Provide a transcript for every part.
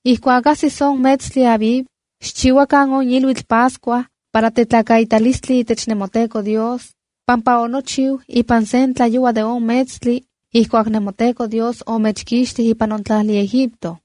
’Ijkuak ajsis on metstli Abib, xchiuakan on iluitl Pascua para tetlakaitalistli itech nemoTEKO Dios, pampa onochiu ipan sen tlayoua de on metstli ijkuak nemoTEKO Dios omechkixtij ipan on tlajli Egipto.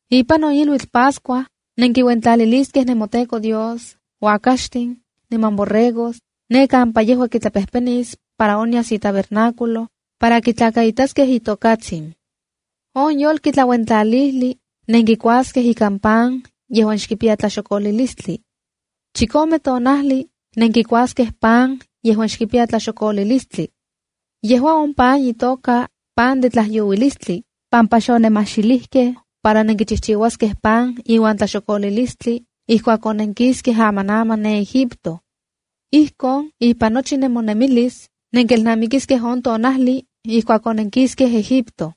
’Ipan on iluitl Pascua, nenkiuentlaliliskej nemoTEKO Dios uakaxtin niman borregos, ne kampa yejua kitlapejpenis para onyas itabernáculo para kitlakaitaskej itokatsin. On yolki tlauentlalijli nenkikuaskej ikan pan yejuan xkipiya tlaxokolilistli. Chikome tonajli nenkikuaskej pan yejuan xkipiya tlaxokolilistli. (Yejua on pan itoka ‘Pan de Tlajyouilistli’, pampa xonenmajxilijkej para nenkichijchiuaskej pan iuan tlaxokolilistli ijkuak onenkiskej amanaman ne Egipto.) Ijkon ipan nochi nemonemilis nenkelnamikiskej on tonajli ijkuak onenkiskej Egipto.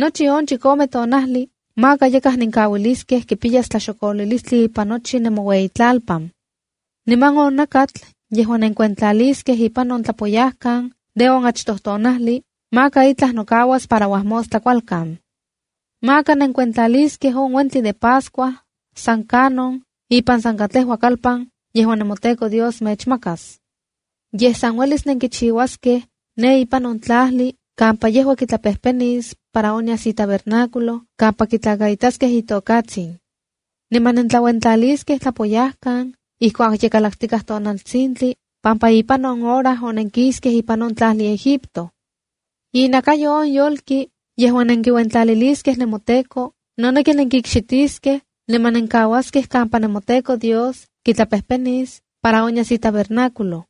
Nochi on chikome tonajli maka yakaj nenkaualiskej kipiyas tlaxokolilistli ipan nochi nemoueyitlalpan. Niman on nakatl yejuan nenkiuentlaliskej ipan on tlapoyajkan de on achtoj tonajli, maka itlaj nokauas para uajmostla kualkan. ’Maka nenkuentlaliskej on uentli de Pascua san kanon ipan san katlejua kalpan yejuan nemoTEKO Dios mechmakas. Yej san uelis nenkichiuaskej ne ipan on tlajli kampa yejua kitlapejpenis para onyas itabernáculo kampa kitlakaitaskej itokatsin. Niman nentlauentlaliskej tlapoyajkan ijkuak ye kalaktikaj tonaltsintli, pampa ipan on hora onenkiskej ipan on tlajli Egipto. Inakayo on yolki yejuan nenkiuentlaliliskej nemoTEKO noneki nenkikxitiskej niman nenkuaskej kampa nemoTEKO Dios kitlapejpenis para onyas itabernáculo.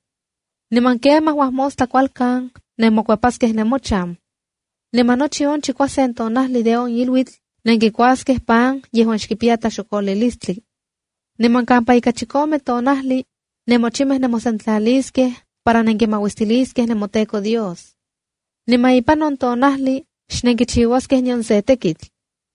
Niman kemaj uajmostla kualkan nenmokuepaskej nemochan. Niman nochi on chikuasen tonajli de on iluitl nenkikuaskej pan yejuan xkipiya tlaxokolilistli. Niman kampa ika chikome tonajli, nemochimej nemosentlaliskej para nenkimauistiliskej nemoTEKO Dios. Niman ipan on tonajli xnenkichiuaskej nion se tekitl.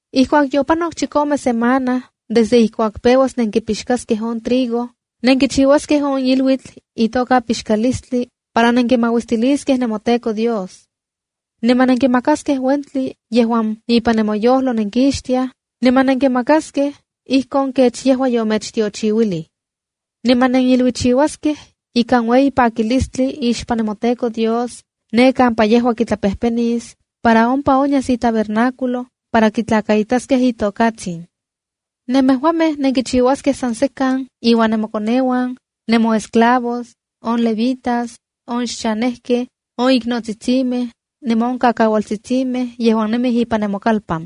’Ijkuak yopanok chikome semana desde ijkuak peuas nenkipixkaskej on trigo, nenkichiuaskej on iluitl itoka Pixkalistli para nenkimauistiliskej nemoTEKO Dios. Niman nenkimakaskej uentli yejuan ipan nemoyojlo nenkixtiaj, niman nenkimakaskej ijkon kech yejua yomechtiochiuilij. Niman neniluichiuaskej ikan ueyi pakilistli ixpan nemoTEKO Dios ne kampa yejua kitlapejpenis para ompa onyas itabernáculo para kitlakaitaskej itokatsin. Nemejuamej nenkichiuaskej san sekan iuan nemokoneuan, nemoesclavos, on levitas, on xchanejkej, on iknotsitsimej, niman on kaualtsitsimej yejuan nemij ipan nemokalpan.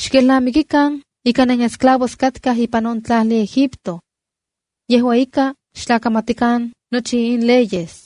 Xkelnamikikan ika nenesclavos katkaj ipan on tlajli Egipto. Yejua ika, xtlakamatikan nochi in leyes.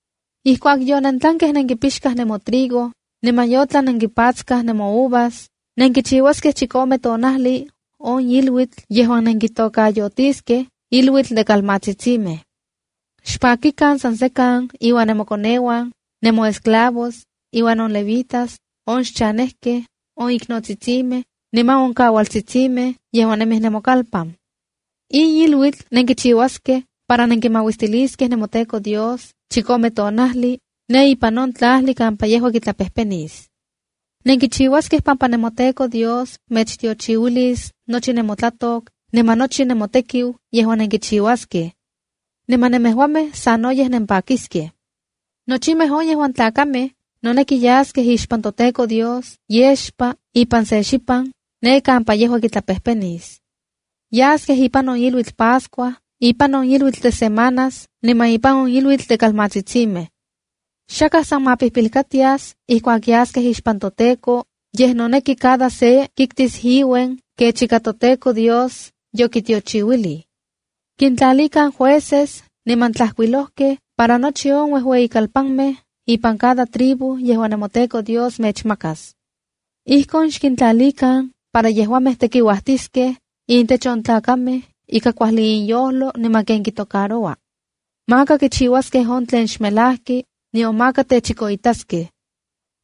’Ijkuak yonentlankej nenkipixkaj nemotrigo, niman yotlan nenkipatskaj nemouvas, nenkichiuaskej chikome tonajli on iluitl yejuan nenkitokayotiskej Iluitl de Kalmatsitsimej. Xpakikan san sekan iuan nemokoneuan, nemoesclavos, inuan on levitas, on xchanejkej, on iknotsitsimej, niman on kaualtsitsimej yejuan nemij nemokalpan. ’In iluitl nenkichiuaskej para nenkimauistiliskej nemoTEKO Dios chikome tonajli, ne ipan on tlajli kampa yejua kitlapejpenis. Nenkichiuaskej pampa nemoTEKO Dios mechtiochiuilis nochi nemotlatok niman nochi nemotekiu yejuan nenkichiuaskej. Niman nemejuamej sanoyej nempakiskej. ’Nochimej on yejuan tlakamej noneki yaskej ixpan toTEKO Dios yexpa ipan se xipan, ne kampa yejua kitlapejpenis. Yaskej ipan on iluitl Pascua, ipan on iluitl de Semanas niman ipan on iluitl de Kalmatsitsimej. Xakaj san ma pijpilkatias ijkuak yaskej ixpan toTEKO, yej noneki cada se kiktis iuen kech ika toTEKO Dios yokitiochiuilij. ’Xkintlalikan jueces niman tlajkuilojkej para nochi on uejueyikalpanmej ipan cada tribu yejuan nemoTEKO Dios mechmakas. Ijkon xkintlalikan para yejuamej tekiuajtiskej intech on tlakamej ika kuajli inyojlo niman ken kitocaroua. Maka kichiuaskej on tlen xmelajki, nion maka techikoitaskej.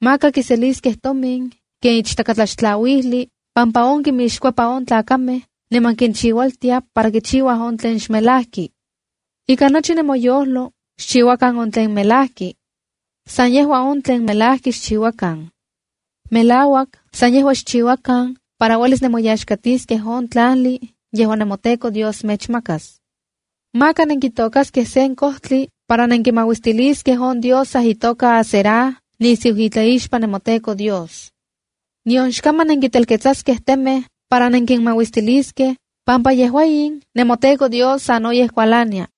Maka kiseliskej tomin ken ichtakatlaxtlauijli pampa on kimixkuepa on tlamatkej niman kinchiualtia para kichiuaj on tlen xmelajki. ’Ika nochi nemoyojlo xchiuakan on tlen melajki. San yejua on tlen melajki xchiuakan. Melauak san yejua xchiuakan para uelis nemoyaxkatiskej on tlajli yejuan nemoTEKO Dios mechmakas. ’Maka nenkitokaskej sen kojtli para nenkimauistiliskej on diosa itoka Asera nisiu itlaixpan nemoTEKO Dios. Nion xkaman nenkintelketsaskej temej para nenkinmauistiliskej, pampa yejua in nemoTEKO Dios sanoyej kualania.